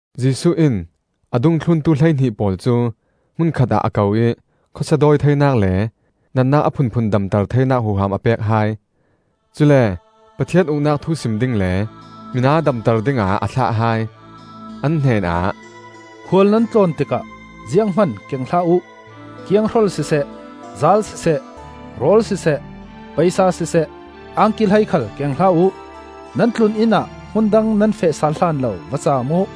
Jesuh in a dungthluntu hleihnih pawl cu hmun khatah a ko ih khawsia dawi theinak le natnak a phunphun damter theinak huham a pek hai. Cule Pathian Uknak thu sim ding le mina damter dingah a thlah hai. An hnenah, “Khual nan tlawn tikah zianghman keng hlah uh: kianghrol siseh, zaal siseh, rawl siseh, paisa siseh, angki hlei khal keng hlah uh. Nan tlun-inn ah hmun dang nan feh sal hlan lo va caam uh.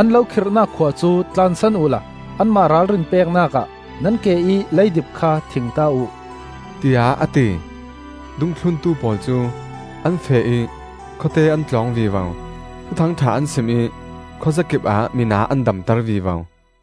An lo khirnak khua cu tlansan uhla anmah ralrin peknak ah nan ke ih leidip kha thingta uh,” tiah a ti. Dungthluntu pawl cu an feh ih khawte an tlawng vivo; Thuthangṭha an sim ih khuazakip ah mina an damter vivo.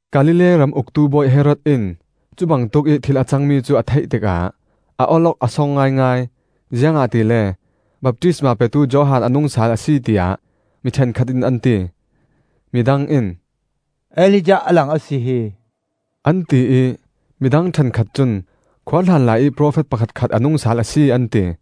Galilee ram uktu bawi Herod in cu bangtuk ih thil a cangmi cu a theih tikah a awlok a song ngaingai, ziangahtile baptistma petu Johan a nung sal a si tiah mi ṭhenkhat in an ti. Midang in, “Elijah a lang a si hi,” an ti ih midang ṭhenkhat cun khuahlan laiih profet pakhatkhat a nung sal a si, an ti.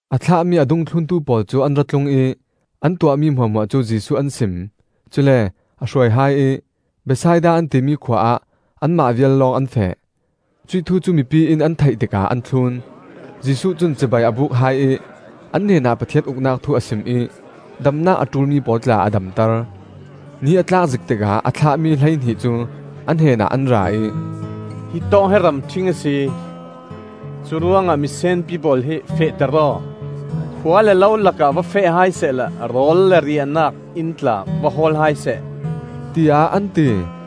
A thlahmi a dungthluntu pawl cu an ra tlung ih an tuahmi hmuahhmuah cu Jesuh an sim. Cule a hruai hai ih Bethsaida an timi khua ah anmah vial lawng an feh. Cuih thu cu mipi in an theih tikah an thlun. Jesuh cun cibai a buk hai ih an hnenah Pathian Uknak thu a sim ih damnak a ṭulmi pawl tla a damter. Ni a tlak zik tikah a thlahmi hleihnih cu a hnenah an ra ih, “Hitawk hi ramṭhing a si; curuangah misenpi pawl hi fehter aw, khua le lo lakah va feh hai sehla rawl le riahnak inn tla va hawl hai seh,” tiah an ti.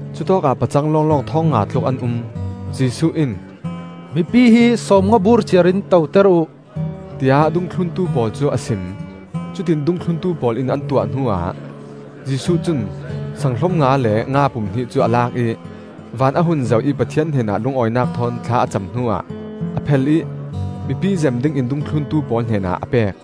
Cutawkah pacang lawnglawng thawng nga tluk an um. Jesuh in, “Mipi hi sawmnga bur ciar in toter uh,” tiah dungthluntu pawl cu a sim. Cutiin dungthluntu pawl in an tuah hnuah, Jesuh cun saang hlom nga le nga pum hnih cu a lak ih van a hun zoh ih Pathian hnenah lungawinak thawn thla a cam hnuah a phel ih mipi zem dingin dungthluntu pawl hnenah a pek.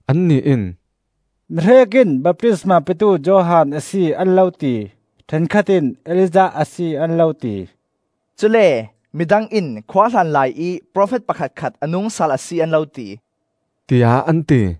Annih in, “Mihrek in baptisma petu Johan a si, an lo ti. Ṭhenkhat in Elijah a si, an lo ti. Cule midang in khuahlan laiih profet pakhatkhat a nungsal a si, an lo ti,” tiah an ti.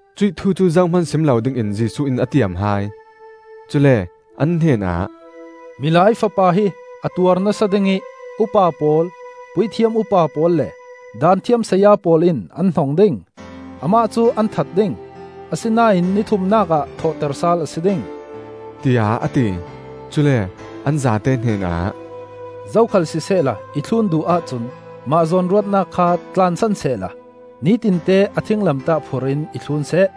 Cuih thu cu zohman sim lo dingin Jesuh in a tiam hai. Cule an hnenah, “Milai Fapa hi a tuar nasa ding ih upa pawl, puithiam upa pawl le Daanthiam saya pawl in an hnong ding. Amah cu an that ding; asinain ni thumnak ah thawhter sal a si ding,” tiah a ti. Cule an zate hnenah, “Zokhal sisehla i thlun duh ahcun mah zawnruahnak kha tlansan sehla nitinte a thinglamtah phur in i thlun seh.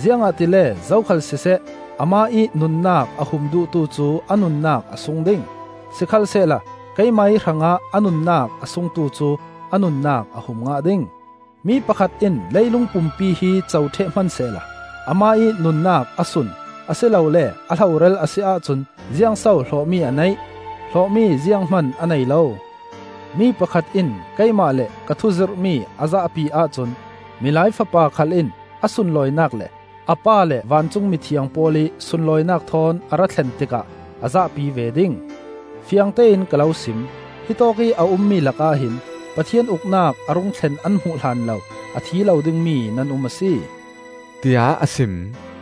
Ziangahtile zokhal siseh amah ih nunnak a hum duhtu cu a nunnak a sung ding; sikhalsehla keimah ih hrangah a nunnak a sungtu cu a nunnak a hum ngah ding. Mi pakhat in leilung pumpi hi co ṭheh hmansehla amah ih nunnak a sun, a si lole a hloral a si ahcun ziangso hlawhmi a neih? Hlawhmi zianghman a nei lo. Mi pakhat in keimah le ka thu zirhmi a zahpi ahcun Milai Fapa khal in a sunlawinak le a Pa le vancung mithiang pawl ih sunlawinak thawn a ra thlen tikah a zahpi ve ding. Fiangtein ka lo sim: hitawk ih a ummi lakah hin, Pathian Uknak a rung thlen an hmuh hlan lo, a thi lo dingmi nan um a si,” tiah a sim.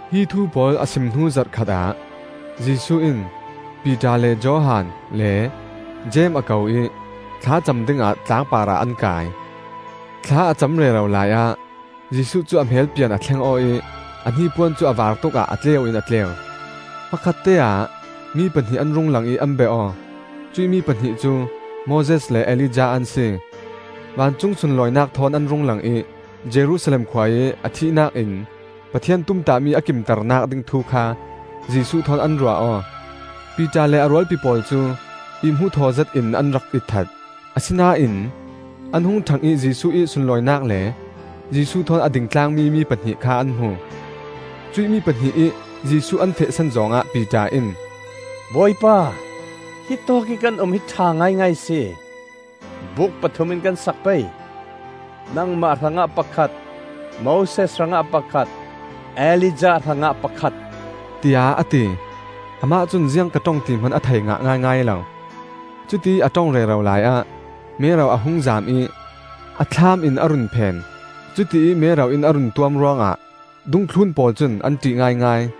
Hi thu pawl a sim hnu zarh khatah Jesuh in Piter le Johan le Jeim a ko ih thlacam dingah tlangpar ah an kai. Thla a cam rero laiah Jesuh cu a hmelpian a thleng aw ih a hnipuan cu a vaar tukah a tleu in a tleu. Hmakhatteah mi pahnih an rung lang ih an bia aw. Cuih mi pahnih cu Moses le Elijah an si. Vancung sunlawinak thawn an rung lang ih Jerusalem khua ih a thihnak in Pathian tumtahmi a kimternak ding thu kha Jesuh thawn an ruah aw. Piter le a rualpi pawl cu ih-hmuh thaw zetin an rak itthat; asinain an hung ṭhang ih Jesuh ih sunlawinak le Jesuh thawn a ding tlangmi mi pahnih kha an hmu. Cuih mi pahnih ih Jesuh an fehsan zawng ah Piter in, “Bawipa, hitawk ih kan um hi a ṭha ngaingai a si! Buuk pathum in kan sak pei; nangmah hrangah pakhat, Moses hrangah pakhat, Elijah hrangah pakhat,” tiah a ti. Amah cun ziang ka ṭong ti hman a thei ngah ngaingai lo. Cutiih a ṭong rero laiah mero a hung zaam ih a thlaam in a run phen; cutiih mero in a run tuam ruangah dungthlun pawl cun an ṭih ngaingai.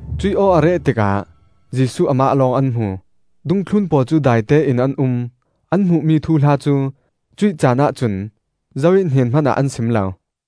Cuih aw a reh tikah Jesuh amah lawng an hmu. Dungthlun pawl cu daitein an um; an hmuhmi thuhla cu cuih caanah cun zo ih hnen hmanah an sim lo.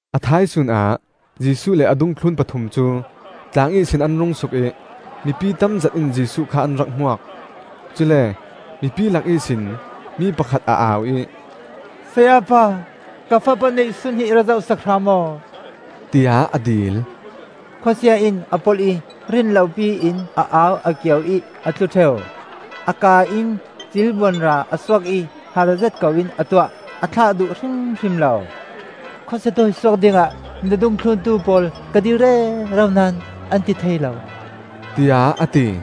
A thaisun ah Jesuh le a dungthlun pathum cu tlang ihsin an rung suk ih mipi tamzet in Jesuh kha an rak hmuak. Cule mipi lak ihsin mi pakhat a au ih, “Sayapa, ka fapa neihsun hi i ra zoh sak hram aw,” tiah a dil. “Khawsia in a polh ih rin lopi in a au a kio ih a tlu ṭheu; a kaa in cilbuanra a suak ih harzet koin a tuah, a thlah duh hrimhrim lo! Khawsia dawisuak dingah na dungthluntu pawl ka dil rero naón an ti thei lo,” tiah a ti.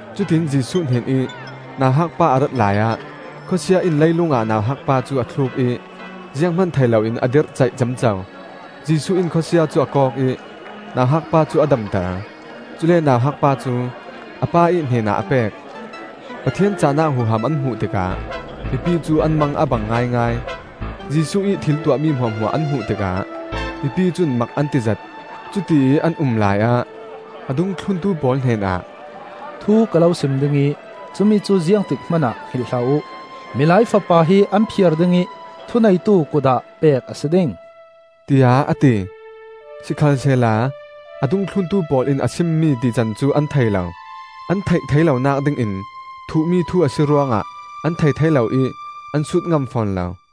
Cutiin Jesuh hnenih nauhakpa a rat laiah khawsia in leilung ah nauhakpa cu a thluk ih zianghman thei loin a dirhcaih ciamco. Jesuh in khawsia cu a kawk ih nauhakpa cu a damter; cule nauhakpa cu a pa ih hnenah a pek. Pathian cahnak huham an hmuh tikah mipi cu an mang a bang ngaingai. Jesuh ih thil tuahmi hmuahhmuah an hmuh tikah mipi cun mak an ti zet; cutiih an um laiah a dungthluntu pawl hnenah, “Thu ka lo sim ding ih cumi cu ziangtik hmanah hngilh hlah uh. Milai Fapa hi an phiar ding ih thuneitu kut ah pek a si ding,” tiah a ti. Sikhalsehla a dungthluntu pawl in a simmi tican an thei lo. An theih thei lonak dingin thuhmi thu a si ruangah an thei thei lo ih an sut ngam fawn lo. Zoso A tumbik?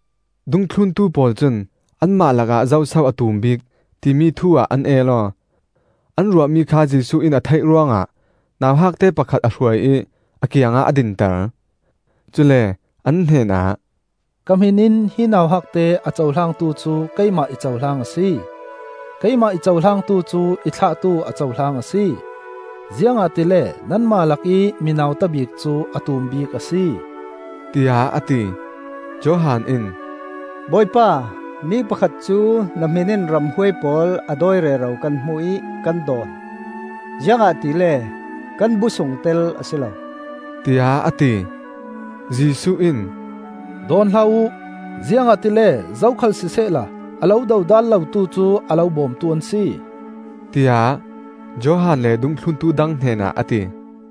Dungthluntu pawl cun anmah lakah zoso a tum bik, timi thu-ah an el aw. An ruahmi kha Jesuh in a theih ruangah nauhakte pakhat a hruai ih a kiangah a dinter. Cule an hnenah, “Ka hmin in hi nauhakte a cohlangtu cu keimah i cohlang a si; keimah i cohlangtu cu i thlahtu a cohlang a si. Ziangahtile nanmah lakih mi nautabik cu a tum bik a si,” tiah a ti. Johan in, “Bawipa, mi pakhat cu na hmin in ramhuai pawl a dawi rero kan hmu ih kan dawn; ziangahtile kan bu sungtel a si lo,” tiah a ti. Jesuh in, “Dawn hlah uh; ziangahtile zokhal sisehla a lo dodal lotu cu a lo bawmtu an si,” tiah Johan le dungthluntu dang hnenah a ti.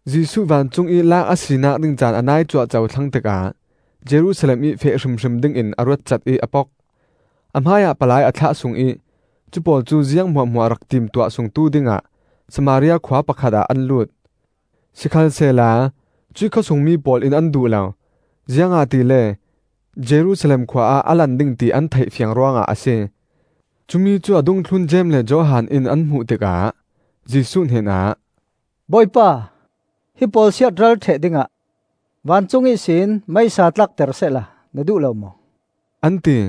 Jesuh vancungih laak a sinak ding caan a nai cuahco thlang tikah Jerusalem ih feh hrimhrim dingin a ruatcat ih a pok. A hmaiah palai a thlah sung ih cupawl cu ziang hmuahhmuah rak timtuah sungtu dingah Samaria khua pakhat ah an lut. Sikhalsehla cuih khawsungmi pawl in an duh lo, ziangahtile Jerusalem khua ah a lan ding ti an theih fiang ruangah a si. Cumi cu a dungthlun Jeim le Johan in an hmuh tikah Jesuh hnenah, “Bawipa, hi pawl siatral ṭheh dingah vancung ihsin meisa tlakter sehla na duh lo maw?” an ti.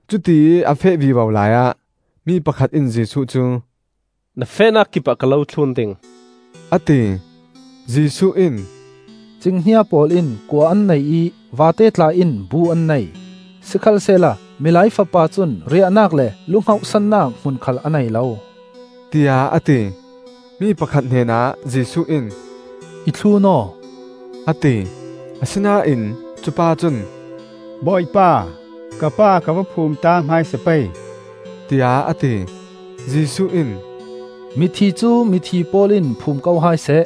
Cutiih a feh vivo laiah mi pakhat in Jesuh cu, “Na fehnak kipah ka lo thlun ding,” a ti. Jesuh in, “Cinghnia pawl in kua an nei ih vate tla in bu an nei; sikhalsehla Milai Fapa cun riahnak le lu hngauhsannak hmun khal a nei lo,” tiah a ti. Mi pakhat hnenah Jesuh in, “I thlun aw,” a ti. Asinain cupa cun, “Bawipa, ka pa ka va phumta hmaisa pei,” tiah a ti. Jesuh in, “Mithi cu mithi pawl in phum ko hai seh.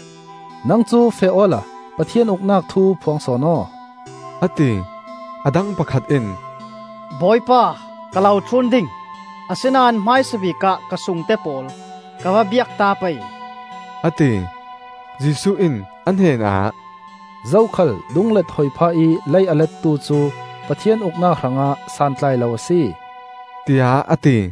Nang cu feh awla Pathian Uknak thu phuang sawn aw,” a ti. A dang pakhat in, “Bawipa, ka lo thlun ding; asinain hmaisabik ah ka sungte pawl ka va biakta pei,” a ti. Jesuh in a hnenah, “Zokhal dunglet hoi phah ih lei a lettu cu Pathian Uknak hrangah santlai lo a si,” tiah a ti.